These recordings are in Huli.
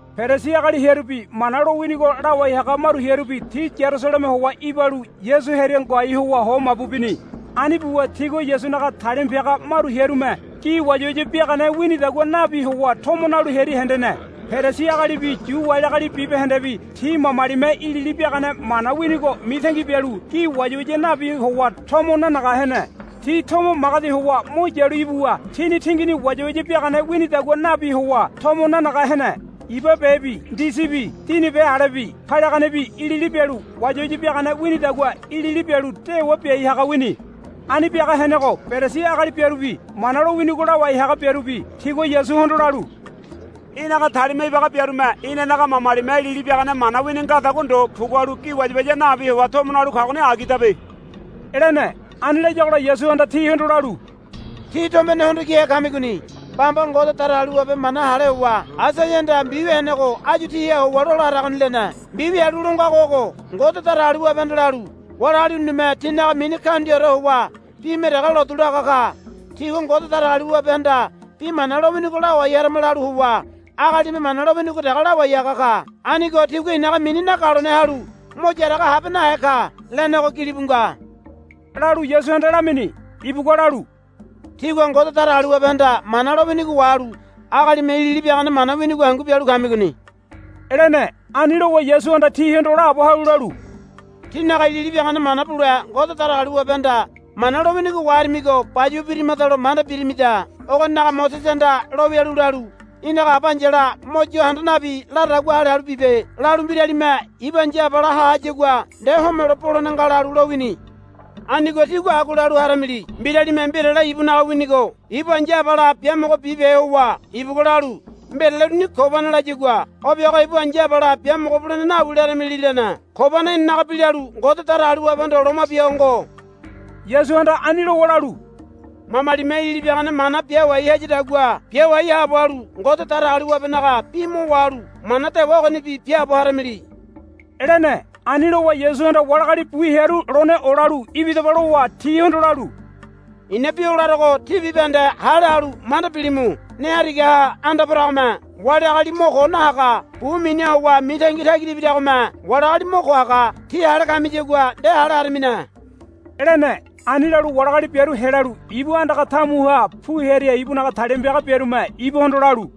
Perisi agali hearubi Mana lowinigo lawai haga maru hearubi ti Yarusaleme howa ibalu Yasu hearia ngoai howa ho mabu bini. Ani buwa tigua Yasunaga talima piaga maru hearume gi wayawaya biagane winidagua nabi howa tomo nalu hearia hendene. Perisi agalibi Yu wali agali bibahendebi ti mamalime ilili biagane mana winigo mitangi bialu gi wayawaya nabi howa tomo nanaga hene. Ti tomo magedi howa mo yalu ibuwa tini tingini wayawaya biagane winidagua nabi howa tomo nanaga hene. Iba bebi ndisibi dini be alebi paliaganebi ilili bialu wayawaya biagane winidagua ilili bialu dewa biai haga wini. Ani biaga henego Perisi agali biarubi Mana lowinigo lawai haga biarubi tigua Yasuhondo lalu, Í̠naga talima ibaga biarume inanaga mamalime ilili biagane mana wini ngadagua ndo pugualu gi wayawaya nabi howa tomo nalu kagoni agidabe, lene. Ani layagola Yasuhanda tihondo lalu, Tí tombene hondo kihe kamigoni. Bamba Ngode Datagaliwabe mana hale howa Aisaiahanda mbiwia henego áyu tíha howa lola haragoni, lene. Mbiwia halu lo ngago ogo. Ngode Datagaliwabehanda lalu, Wali agali urunime tinaga mini kaundiaore howa bime dege lotu laga ka. Tigua Ngode Datagaliwabehanda bi mana lowinigo lawai harama lalu howa agalime mana lowinigo dege lawai haga ka. Anigo tigua i̱naga mini nagalone halu mo yaraga habe nahe ka, lenego gilibu nga, lalu Yasuhanda lamini. Ibugua lalu, Tígua Ngode Datagaliwabehanda mana lowinigo wahalu agalime ilili biagane mana winigo hangu bialu kamigoni, lene. Ani lowa Yasuhanda tihondo laabo halu lalu, Tínaga ilili biagane mana bule Ngode Datagaliwabehanda mana lowinigo waharimigo bayuwa birimadalo manda birimida. Ogoninaga Mosesehanda lowialu lalu, Í̠naga aba ai̱yala mo yo handa nabi laradagua hale halu bibe, lalu, Mbiralime ibu aba ai̱ya ha hayagua nde homelo bolene nga, lalu lowini. Anigo tígua agua lalu haramili. Mbiralime mbirale ibunaga winigo ibu ai̱ya abala biamogo bibehe howa ibugua lalu, Mbirale uruni Kobana, layagua o biago ibu ai̱ya abala biamogo bulene nawi laramili, lene. Kobana inanaga bi lalu, Ngode Datagaliwabehondo loma bia ho ngo. Yasuhanda ani lowa lalu, Mamalime ilili biagane mana biawai hayadagua biawai haabo halu Ngode Datagaliwabenaga bi mo wahalu mana dewa ogonibi biaabo haramili, lene. Ani lowa Yasuhanda wali agali bu hearu lone olalu, Ibidaba, lowa tihondo lalu, I̱na bi o larogo tí bibahende hale halu manda bilimu. Ne harigaha anda poragome wali agali mo ko nahaga. Bu miniha howa mitangi tagira ibiragome wali agali mo ko haga. [ Tí hale kamiyagua nde hale haramine, lene.] Ani lalu wali agali biaru helalu ibu andaga tamuha pu hearia ibunaga talima piaga biarume ibuhondo lalu,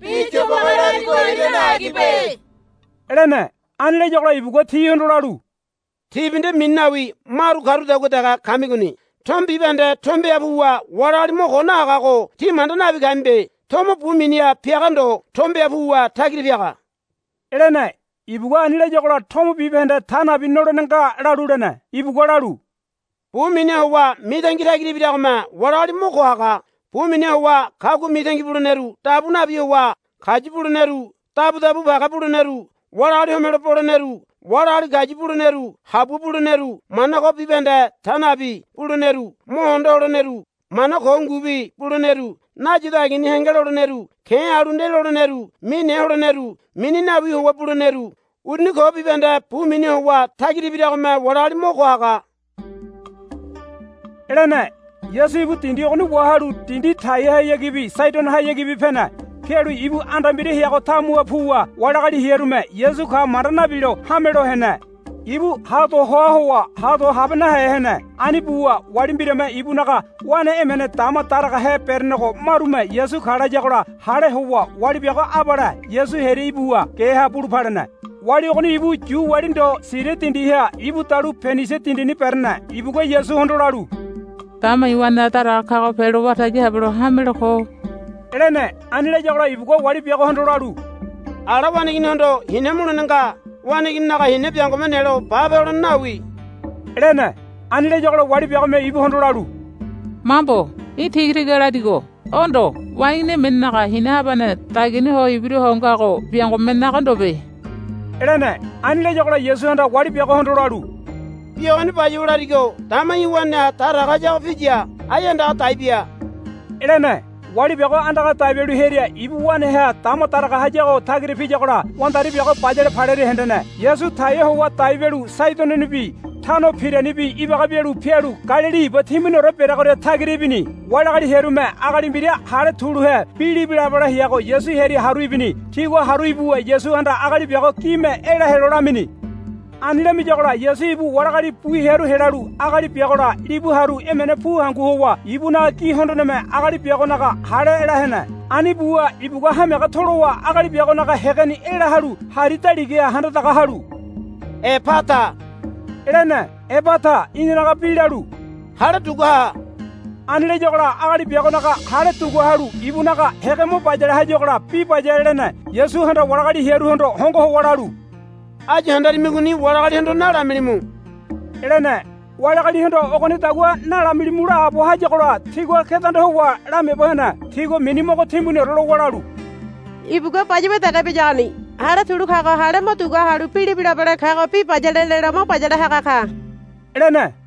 Bi yobage larigo irane agibe, lene. Ani layagola ibugua tihondo lalu, Tíbi nde mini nawi maru karudagua dege kamigoni. Tomo bibahende tombeha puwa wali agali mo ko nahagago tí manda nabi kamibe. Tomo bu miniha piaga ndo tombeha puwa tagira piaga, lene. Ibugua ani layagola tomo bibahende ta nabi nolene nga, lalu lene. Ibugua lalu, Bu miniha howa mitangi tagira ibiragome wali agali mo ko haga. Bu miniha howa kagua mitangi buleneru dabu nabi howa kayu buleneru dabudabu page buleneru wali agali homelo boleneru wali agali kayu buleneru habua buleneru mana ko bibahende ta nabi buleneru mo hondo holeneru mana ko ngubi buleneru nayido agini henge loleneru ke̱ halu nde loleneru mine holeneru mini nawi howa buleneru uruni ko bibahende bu miniha howa tagira ibiragome wali agali mo ko haga, lene. Yasu ibu dindi ogoni wahalu dindi Taiahayagibi Saidonohayagibi pene. Pialu ibu anda mbira heago tamuha puwa wali agali hearume, Yasu ka, manda nabilo hame lo hene. Ibu ha do hoa howa ha do habe nahe hene. Ani buwa wali mbirame ibunaga wane emene dama daragahe berenego marume, Yasu ka, layagola hale howa wali biago abale Yasu hearia ibuwa geha bulu palene. Wali ogoni ibu Yu wali ndo Siria dindiha ibu dalu Penisia dindini berene. Ibugua Yasuhondo lalu, Dama i̱ waneha daraga kago pelo wara tagi habelo hamelo ko, lene. Ani layagola ibugua wali biagohondo lalu, Ala waneiginihondo hina mulene nga. Waneigininaga hina biangome nelo bape holene nawi, lene. Ani layagola wali biagome ibuhondo lalu, Mambo. Í̠ tiga tiga larigo. O ndo waneigini emenenaga hina habane dagiani howa ibira ho ngago biangome naga ndobe, lene. Ani layagola Yasuhanda wali biagohondo lalu, Bi ogoni bayuwa larigo dama í̠ waneha daraga hayago piya. Ai andaga dai bia, lene. Wali biago andaga dai bialu hearia ibu waneha dama daraga hayago tagira piyagola wandari biago bayale palearia hendene. Yasu Taia howa dai bialu Saidononibi Tano Piranibi ibaga bialu pialu Galili iba timbuniore bereagoria tagira ibini. Wali agali hearume agali mbira hale tuluhe bi libilabale heago Yasu hearia haru ibini. Tigua haru ibuwa Yasuhanda agali biago gime ela helo lamini. Ani lamiyagola Yasu ibu wali agali bu hearu helalu agali biagola libu haru emene pu hangu howa ibunaga gi hondoneme agali biagonaga hale ela hene. Ani buwa ibugua hamiaga tolowa agali biagonaga hégeni ela halu hari daligaha handa daga halu, Epata, lene. Epata inanaga bi lalu, Hale dugua ha. Ani layagola agali biagonaga hale dugua halu ibunaga hége mo bayale hayagola bi bayale lene. Yasuhanda wali agali hearuhondo hongo howa lalu, Áyu handarimigoni wali agalihondo nalamilimu, lene. Wali agalihondo ogonidagua nalamilimu laabo hayagola tigua kedanda howa lamiaabo hene. Tigua mini mogo timbuniore lowa lalu, Ibugua bayuwa dege biyagoni. Hale tulu kago hale mo dugua halu bi libilabale kago bi bayale lelo mo bayale haga ka, lene.